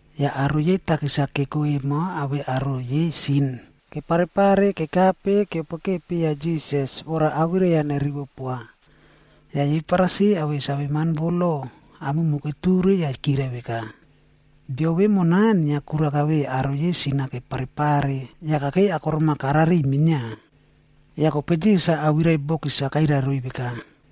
Yah aro yei takis-a keko emo awei aro yei sin keparepare kekape keoroka papiya Jisas vora awirai-a nerivo poa. Yah yei Farisi awei saveman vo lo, aomumu keture yah kirai veka, “Bio vemona inia kura kaveiy aro yei sin-a kepare pare, yah kakei akorom-a kara riꞌiy minia.” Yah kope Jisas-a awirai bokis-a kairai roiy veka,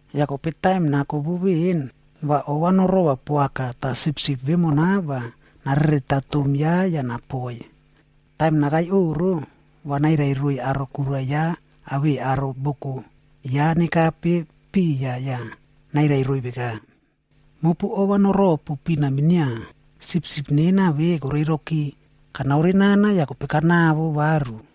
Yah kope taim nako vo veꞌen, va ova norova poaka tah sipsip vemona va narereta tom ya yah napoiy. Taim nakai oꞌro, va nairai roiy aro kura ya awei aro boko ya nekape piya yah nairai roiy veka, ‘Mopu ova noropu pina minia, sipsip nena ve koreroki, kanaore nana yah kope kanawo varu.’”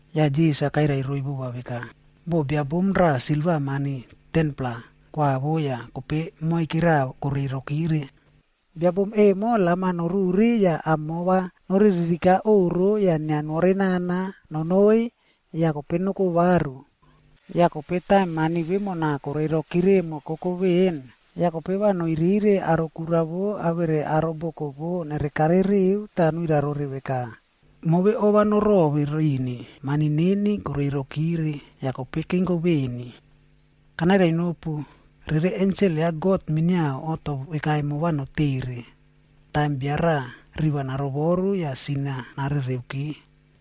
Yah Jisas-a kairai roiy vova veka, “Boh bia bom raꞌa silva mani 10-plaa koawo yah kope moike raꞌa korei rokire. Bia bom emo lam-a noruri yah amo va noriririka oꞌro yah inia nore nana nonoi yah kope noko varu. Yah kope taim mani vemona korei rokire emo koko veꞌen, yah kope va noirire aro kura vo awere aro boko vo nerekare riu tah nuirai rore veka, ‘Move ova norove rini, mani neni korei rokire, yah kope kenko veni.’ Kanairai nopu, rere ensel ya God minia oꞌto veka emo va notere, taim bia raꞌa riva narovoru yah sin-a narereuki.”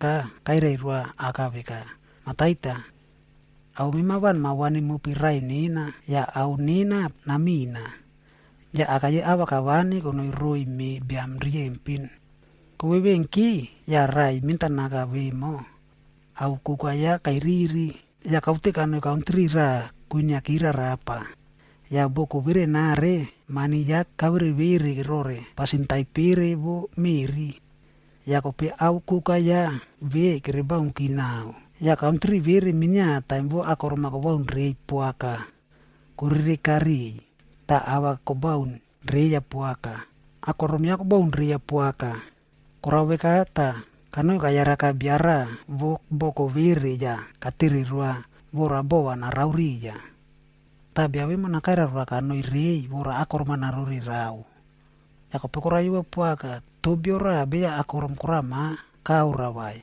Kope raꞌai mentanaka kairai roa aka veka, ‘Mah Taita, ao mema va nama vani mopi raꞌai nena, yah ao nena namina.’ Yah aka yei ava kavani konoi roiy me biam riyempin. “Kovevenki, yah raꞌai mentanaka vemo, ao koka ya kairiri, yah kaute kanoi kantri raꞌa kwiniaki rarapa. Yah boko verenare, mani ya kavere vere rore pasin taipere vo meꞌri. Yah kope ao koka ya ve kerebaunki naꞌao, yah kantri vere minia taim vo akorom-a kobaun reiy poaka korereka riꞌiy, tah ava kobaun reiya poaka. Akorom ya kobaun reya poaka. Kora veka tah kanoi kayaraka bia raꞌa vo boko vere yah katere roa vora bova narao riya. Tah bia vemona kairai roa kanoi reiy vora akorom-a narore rao. Yah kope koraiyova poaka, toh bio raꞌa beya akorom korama karoa vai.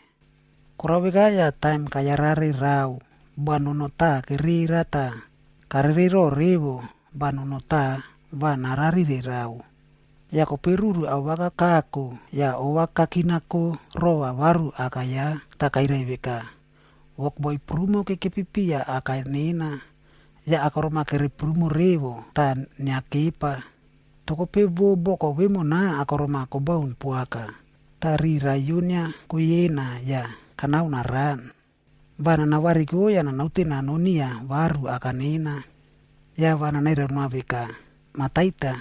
Kora veka yah taim kayarare rao banono taꞌa kerera tah karerero revo banono taꞌa va nara rire rao. “Yah kope ruru awaka kako, yah ova kakinako rova varu aka ya, tah kairai veka, ‘Wokboi prumo kekepi piya aka nena, yah akorom-a kere prumo revo, tah inia kepa. Toh kope vo boko vemona akorom-a kobaun poaka, tah riꞌi raiyo inia koyena yah kanao naran. Va nana variko yah nanaute nanon niya varu aka nena, yah va nanairai noa veka, “Mah Taita,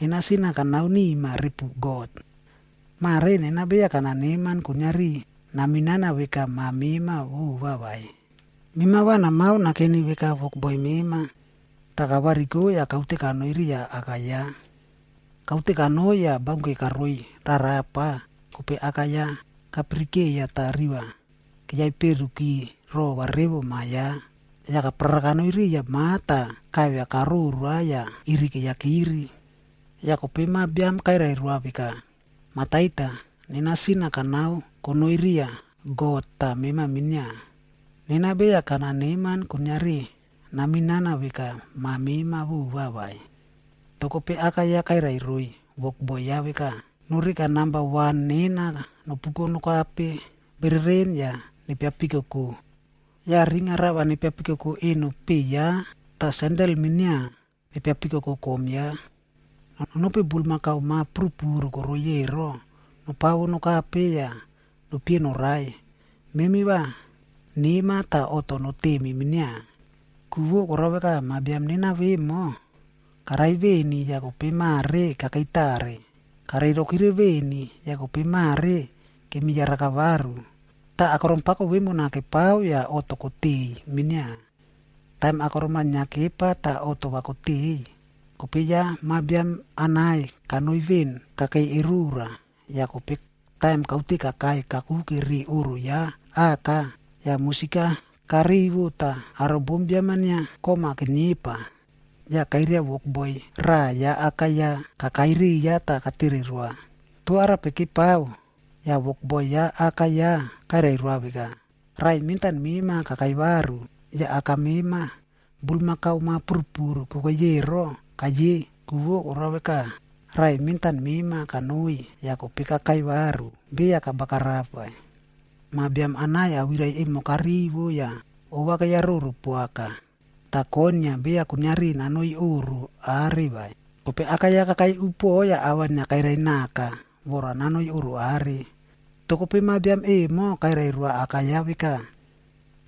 nena sin-a kanao nima repu God. Mare nena beya kana neman kuiniari naminana veka ma mema vova vai. Mema va namao nakeni veka wokboi mema.” ’ Tah kavariko yah kaute kanoi riya aka ya. “Kaute kanoi yah baunke karoi rarapa, kope aka ya kapirikeiya tah riva keyaperuki rova revo ma ya. Yah kaparara kanoi riya ma tah kaivia karoroa yah iri keiyakiri. “Yah kope ma biam kairai roa veka, ‘Mah Taita, nena sin-a kanao konoi riya God tah mema minia. Nena beya kana neman kuiniari naminana veka ma mema vova vai.’ “Toh kope aka ya kairai roiy wokboi ya veka, ‘Noreka namba wan nena nopuko nokape bereren yah nepiapikoko. Yah ring-ab rava nepiapikoko eno peꞌe ya tah sendel-a minia nepiapikoko kom ya. Nonopi bulmakau ma purupuru koroiy ero nopawo nokape yah nopie norai. Memi va nema tah oꞌto notemi minia. Ku vo koraka ma biam nena vemo, karai veni yah kope mare kakei tare, kareirokire veni, yah kope mare kemi yaraka varu.’ Tah akorom pako vemona kepao yah oꞌto koteiy minia. “Taim akorom-a inia kepa tah oꞌto va koteiy, kope ya ma biam anai kanoi veꞌen kakei erora. Yah kope taim kaute kakai kakuke ri oꞌro ya aka, yah musik-a karivo tah aro bombiam-a inia kom-a keniepa. Yah kairia wokboi raꞌa ya aka ya kakai riya tah katere roa, ‘toh arape kepao?’ Yah wokboi ya aka ya, kairai roa veka, ‘Raꞌai mentan mema kakai varu, yah aka mema bulmakau ma purupuru kokei ero kaiye, ku vo koraka, raꞌai mentan mema kanoi, yah kope kakai varu, beya kabagarap vai.’ “Ma biam anai awirai emo karivo yah ova keyaroro poaka, tah koinia beya kuiniari nanoi oꞌro are vai. Kope aka ya kakai upuoꞌo yah ava inia kairai naka vora nanoi oꞌro are. Toh kope ma biam emo kairai roa aka ya veka,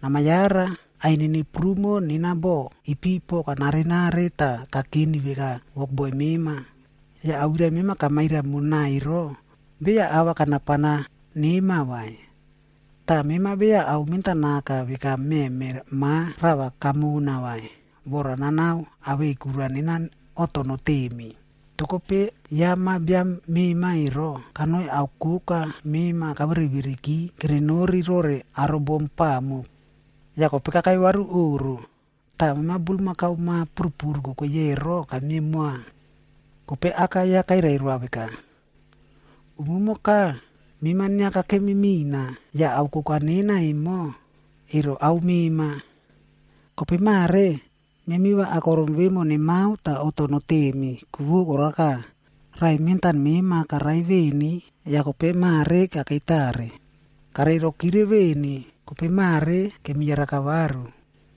‘Nama yara! Ainini prumo nena boꞌo ipipo kanare nare tah kakeni veka wokboi mema, yah awirai mema kamairai mona ero, beya ava kanapana nema vai. Tah mema beya ao mentanaka veka meme ma rava kamona vai, vora nanao awei kura nena oꞌto notemi. Toh kope, ya ma biam mema ero, kanoi ao koka mema kavere vereki kerenori rore aro bom pamuk, yah kope kakai varu oꞌro, tah mema bulmakau ma purupuru kokei ero kamie moa.’ “Kope aka ya kairai roa veka, ‘Umumoka, mema inia kakemi mina, yah ao koka nena emo, ero ao mema. Kope mare, memi va akorom vemo nemao tah oꞌto notemi, ku vo koraka, raꞌai mentan mema karai veni yah kope mare kakei tare. Kareirokire veni, kope mare kemi yaraka varu.’”